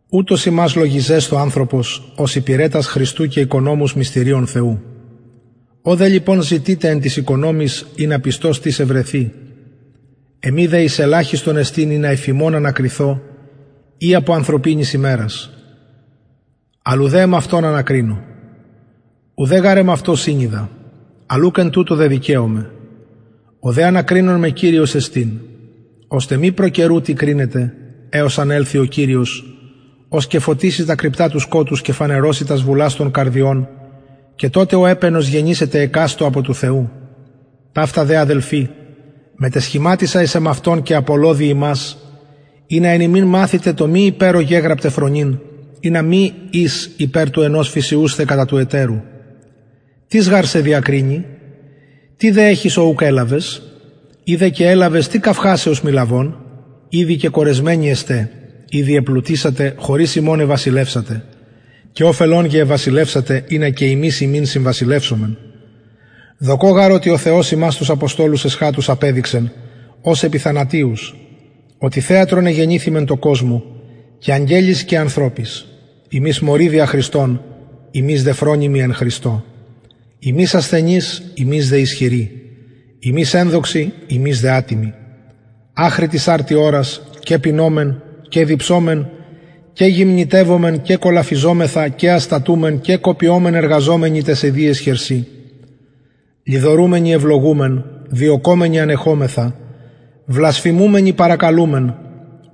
ουτως ημας λογιζεσθω ανθρωπος ως υπηρετας χριστου και οικονομους μυστηριων θεου ο δε λοιπον ζητειται εν τοις οικονομοις ινα πιστος τις ευρεθη εμοι δε εις ελαχιστον εστιν ινα υφ υμων ανακριθω η υπο ανθρωπινης ημερας αλλ ουδε εμαυτον ανακρινω ουδεν γαρ εμαυτω συνοιδα αλλ ουκ εν τουτω δεδικαιωμαι ο δε ανακρινων με κυριος εστιν ωστε μη προ καιρου τι κρινετε εως αν ελθη ο κυριος ος και φωτισει τα κρυπτα του σκοτους και φανερωσει τας βουλας των καρδιων και τοτε ο επαινος γενησεται εκαστω απο του θεου ταυτα δε αδελφοι μετεσχηματισα εις εμαυτον και απολλω δι υμας ινα εν ημιν μαθητε το μη υπερ ο γεγραπται φρονειν ινα μη εις υπερ του ενος φυσιουσθε κατα του ετερου τις γαρ σε διακρινει τι δε εχεις ο ουκ ελαβες ει δε και ελαβες τι καυχασαι ως μη λαβων ηδη κεκορεσμενοι εστε ηδη επλουτησατε χωρις ημων εβασιλευσατε και οφελον γε εβασιλευσατε ινα και ημεις υμιν συμβασιλευσωμεν δοκω γαρ οτι ο θεος ημας τους αποστολους εσχατους απεδειξεν ως επιθανατιους οτι θεατρον εγενηθημεν τω κοσμω και αγγελοις και ανθρωποις ημεις μωροι δια χριστον υμεις δε φρονιμοι εν χριστω ημεις ασθενεις υμεις δε ισχυροι υμεις ενδοξοι ημεις δε ατιμοι αχρι της αρτι ωρας και πεινωμεν και διψωμεν και γυμνητευομεν και κολαφιζομεθα και αστατουμεν και κοπιωμεν εργαζομενοι ταις ιδιαις χερσιν λοιδορουμενοι ευλογουμεν διωκομενοι ανεχομεθα βλασφημουμενοι παρακαλουμεν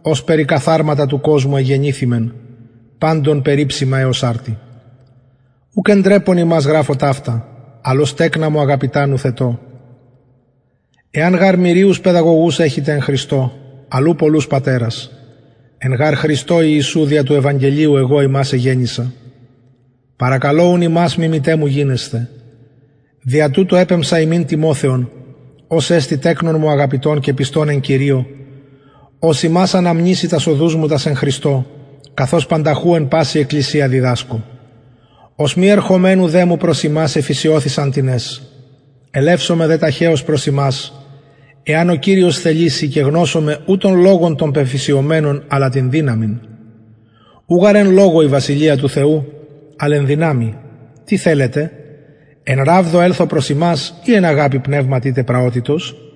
ως περικαθαρματα του κοσμου εγενηθημεν παντων περιψημα εως αρτι ουκ εντρεπων υμας γραφω ταυτα αλλ ως τεκνα μου αγαπητα νουθετω εαν γαρ μυριους παιδαγωγους εχητε εν χριστω αλλ ου πολλους πατερας εν γαρ χριστω ιησου δια του ευαγγελιου εγω υμας εγεννησα παρακαλω ουν υμας μιμηται μου γινεσθε δια τουτο επεμψα υμιν τιμοθεον ος εστιν τεκνον μου αγαπητον και πιστον εν κυριω ος υμας αναμνησει τας οδους μου τας εν χριστω καθως πανταχου εν παση εκκλησια διδασκω ως μη ερχομενου δε μου προς υμας εφυσιωθησαν τινες ελευσομαι δε ταχεως προς υμας εαν ο κυριος θεληση και γνωσομαι ου τον λογον των πεφυσιωμενων αλλα την δυναμιν ου γαρ εν λογω η βασιλεια του θεου αλλ εν δυναμει τι θελετε εν ραβδω ελθω προς υμας η εν αγαπη πνευματι τε πραοτητος